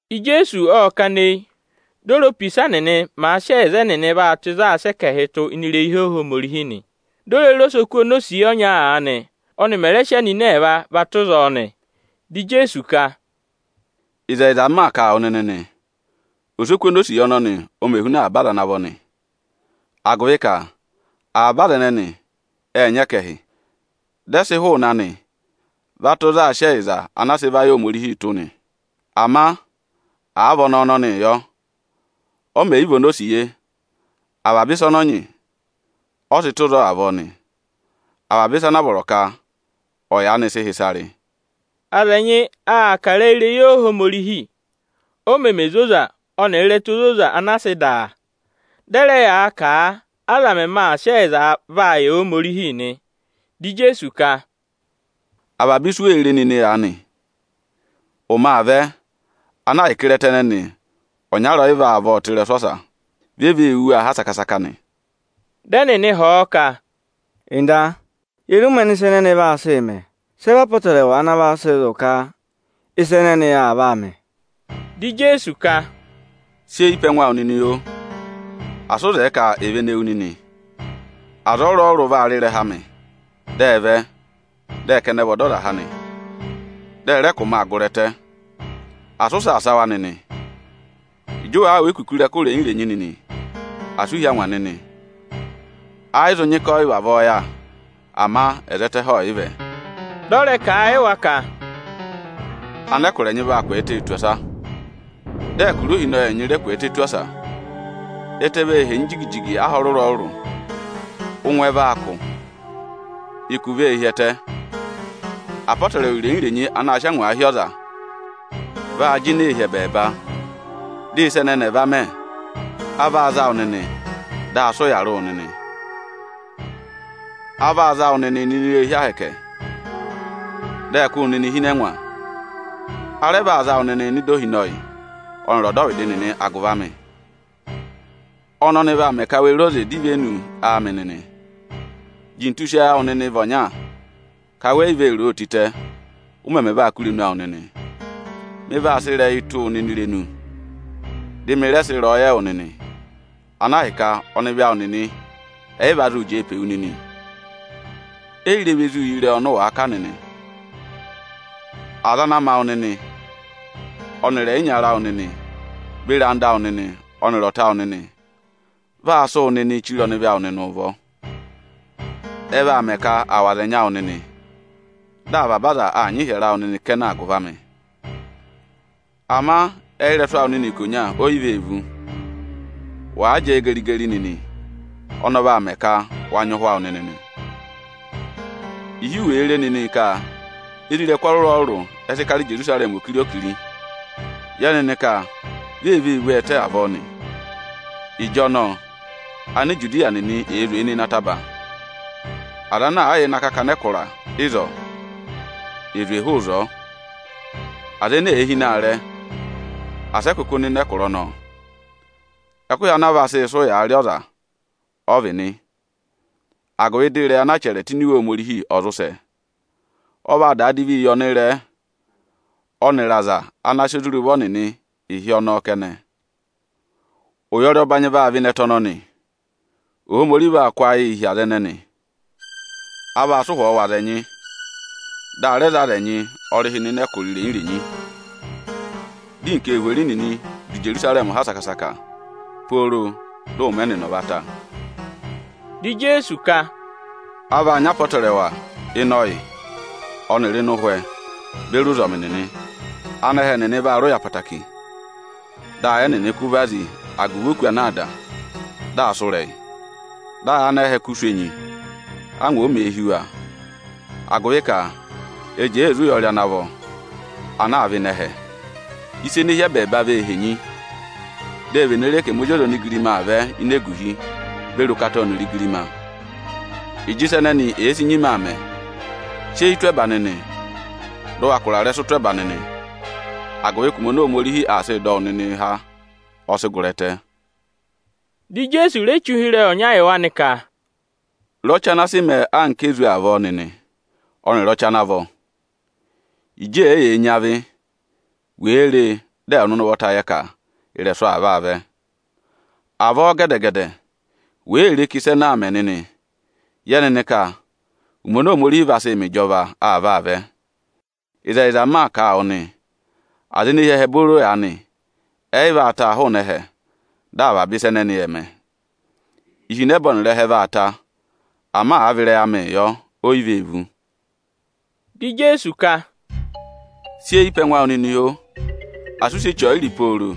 Ijeesu ộ kana eyi, di o re, opisa nịnị màa sị ẹyịza ẹnịnị vaa tụ́ ịzị aā sị ẹkẹhịị tụ́ ini irehi Ohomorihi nị. Di o re re osoku onosiye ọnya aanị, ọ́nị mẹ̀ rẹ sị anini ẹẹva tụ́ ịzọọ nị. Di Ijeesu ka, “Ịzẹyịza m maa kà a wụ nịnị nị, osoku onosiye ọnọnị ọ mẹ huna avaba aza ana vọ nị; agụvị ka avaba aza ẹnẹnị ệ nyị ẹkẹhị, dị ẹ sị hụụnị anị va tụ́ ịzị aā sị ẹyịza ana a sị va yị Ohomorihi tụ́ nị. Ama àa vị ọnẹẹ ọnọnịị yọ, ọ mẹ̀ yị vị onosiye, avaba ịsa ọnị ọ nyị, ọ sị tụ́ ịzọọ avọọ nị, avaba ịsa ana a vọrọ ka ọ̀ yaanị sị hị́ ịsa rị.” Aza ẹnyị aa kà ịrẹyị irehi Ohomorihi, o meme zoza ọnịrị ịrẹta ozoza-ozoza ana a sị dà a. Dị ẹ rẹ yaa kà a, aza mẹmẹ aa sị ẹyịza vaa yị Ohomorihi nị. Dị Ijeesu ka: “Avaba ịsị u wee re nịnị aanị, ụmẹ aa vẹ ana ahịka ịrẹta ẹnẹnị, ọnyara ọ yị vaa vọ tụ́ ịrẹsụ ọsa; vi e vee wú waa ha saka-saka nị.” Dị ẹnịnị họ̀ ọ ka, “Nda, ye re ụmẹ ọnị ịsa ẹnẹnị vaa sị mẹ? Sị ẹ vị apọtẹrẹwa ana vaa sị zụ̀ ka ịsa ẹnẹnị aa vaa mẹ?” Dị Ijeesu ka, “Sị eyi pe ẹngụ awụ nịnị, oo! Asị ụ zẹẹ ka è vene wu nịnị! Aza ọrụrụ-ọrụrụ vaa rị ịrẹha amị, dị ẹ vẹ, dị ẹ ka ẹnị ẹ vị Ọdọzaha nị. Dị ẹ rẹ ka ụmẹ aa gụrị ẹtẹ. Asị ụ saasa wa nịnị! Ịjị ụ wàa wụ́ ekuku ịrẹkụ irenyi-irenyi nịnị, asị u hí angwa nịnị! Ẹ yị zụ nyị ka ọ yị vavọọ yà; ama ẹzẹtẹ ẹhẹ ọọ̀ yị vẹ.” Dị ọ rẹ kà a yị wa ka, “Anẹkụra ẹnyị vaa kwẹẹtẹ tù ọsa, dị ẹkụra ohinọyị ẹnyị rẹ kwẹẹtẹ tù ọsa. Ẹtẹ vee henyi jigi-jigi aha ọrụrụ-ọrụrụ, ụngwẹ vaa kụ̀, ụkụ vee hi ẹtẹ. Apọtẹrẹwa irenyi-irenyi anaā sịị angwaa hí ọza, vaa jịnẹẹ hi ẹbẹẹba. Dị ịsa ẹnẹnị ẹ̀ va mẹ, a vaa za wụ nịnị, dị aa sị ụyaa rị wụ nịnị. A vaa za wụ nịnịị nọ ini irehi Ohomorihi, dị ẹ kụ́ wụ nịnị hi ịnị ẹngwa. A rẹ vaa za wụ nịnịị nọ ịdị ohinọyị ọnịrị ọdọvịdị nịnị agụvị amị. Ọnọnị vaa mẹ ka we re oze dọ ivenu amị nịnị. Jintu sị ayị awụ nịnị vị ọnya ka we yi vee ro o tịtẹ, ụ mẹmẹ vaa kụ́ irenu awụ nịnị! Mị vaa sị ịrẹyị tụ́ wụ nịnị irenu, dị mị rẹ sị ịrẹyọyẹ wụ nịnị, ana ahịka ọnịvị awụ nịnị ẹ yị va zụụ jẹẹ pe wu nịnị, e yi re ve zuu yi ịrẹyị ọnị ụ wàa kà nịnị. Aza ana ma wụ nịnị, ọnịrị ẹyịnyara awụ nịnị beri anda awụ nịnị ọnịrị ọta awụ nịnị vaa sị wụ nịnịị chire ọnịvị awụ nịnị ụvọ. Ẹ vaa mẹ ka à wụ̀ aza ẹnyị awụ nịnị. Dị avaba aza aa nyị ịhyẹrẹ awụ nịnị kẹnẹ agụvị amị. Ama ẹyị ịrẹsụ awụ nịnị ikonya o yi vee vú. Wàa jẹẹ geri-geri nịnị, ọnị ọ vaa mẹ ka wa zụ yara nịnị obooro nị.” “Ịhị wèe re nịnị ka isoja tatarata ẹ sị kara Ijerusarẹmị okiri-okiri, yẹ nịnị ka vi ee vee vú ọọ ẹtẹ avọọ nị. Ịjọnọọ Anijudiya nịnị è zwe nọ ịnị ataba! Aza ana àa yà ịnị akakana ẹkụra ịzọọ, è zwe hụụ ịzọọ! Aza ene èe hi ịnị aarẹ, asị ẹ kụkụ nọ ịnị ẹkụra ọnọọ! Ẹkụhị ana a vaa sị sị ụyaa rị ọza ọ vị nị, agụvị dị ịrẹyị ana a chẹrẹ tụ́ ini Iwe Ohomorihi ọ̀ zụ sẹ. Ọ vaa daa divii yị ọnịrẹẹ ọnịrị aza ana sị ozi rị ụvọ nịnị ịhị ọnọọ kẹnẹ. Ụyọrị ọbanyị vaa vẹ ịnị ẹtẹ ọnọnị, Ohomorihi vaa kụ́ ayịị hi aza ẹnẹnị. A vaa sị ụhwọọ wụ̀ aza ẹnyị, dị a rẹ za aza ẹnyị ọrịhị ne hi ẹkụra irenyi-renyi. Dị anarịmadọwụ nịnị du Ijerusarẹmị ha saka-saka, pooro dị ụmẹ ẹnịnị ọ̀ va ta.” Dị Ijeesu ka, “A vaa nyị apọtẹrẹwa ịnị ọyị ọnịrị ịnị ụhwẹ beri ụzọmị nịnị. Anẹhẹ nịnị vaa rị ụya ẹtẹẹtẹrẹ, dị ayị ẹnịnị kụ́ vazi agụvị òkū ana aa dà, dị aa sụ́ ịrẹyị. Dị ayị anẹhẹ kụ́ sụ̀ enyi, ángwa òo mèe hí wa, agụvị ka ệ jẹẹ ee zí ụyọrị ana vọ ana aa vẹ ịnị ẹhẹ. Ịsa ene hi ẹbẹẹba vee henyi. Di e vene re ka ẹmị Ozi ọza onigirima aa vẹ ini eguhi beri ụkata ọnịrị igirima. Ịjị ịsa ẹnẹnị èe si nyima aa mẹ, sị eyi tụ́ ẹba nịnị, dị ụ wa kụ̀rà ịrẹsụ tụ́ ẹba nịnị, agụvị ka ụmẹ oni Ohomorihi aa sịị dọ wụ nịnịị há, ọ sị gụrị ẹtẹ.” Dị Ijeesu re che ụhịrẹyị ọnya yị wa nị ka, “Re ọchị ana sị mẹẹ anka ezu avọọ nịnị ọnịrị ọchị ana vọ! Ịjị èeyee nyị avị, wèe ree, dị ẹwụ nịnị ụvọta yẹ ka ị̀rẹ̀sụ̀ aa vaa vẹ. Avọọ gẹdẹ-gẹdẹ wèe re ka ịsa ẹnẹẹ aa mẹ nịnị, yẹ nịnị ka ụmẹ oni Ohomorihi vaa sị mẹ ịjọva aa vaa vẹ. Ịzẹyịza m maa kà a wụ nị, aza ene hi ẹhẹ booro aanị, ẹ yị vaa taa hụụnị ẹhẹ, dị avaba ịsa ẹnẹnị ẹ̀ mẹ. Ihinẹba ọnịrị ẹhẹ vaa ta, ama àa vị ịrẹyị amịị yọ, o yi vee vú.” Dị Ijeesu ka, “Sị eyi pe ẹngụ awụ nịnị, oo! Asị ụ sị eche ọyịrị pooro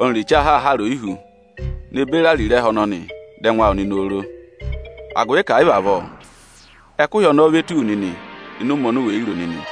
ọnịrị eche ahaahara oyihú ne beri ariro ẹhẹ ọnọnị dọ ẹngụ awụ nịnị oro! Agụvị ka ẹ̀ yị vị avọọ, ẹkụhị ọnọọ o vee tù wu nịnị ịnị ụmẹ oni u wè yi ro nịnị.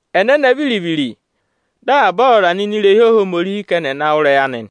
Ẹnẹnẹ viri-viri, dị avaba ọzọza nọ ini irehi Ohomorihi ka ẹnị ẹ̀ na wụ́ ịrẹyị anị.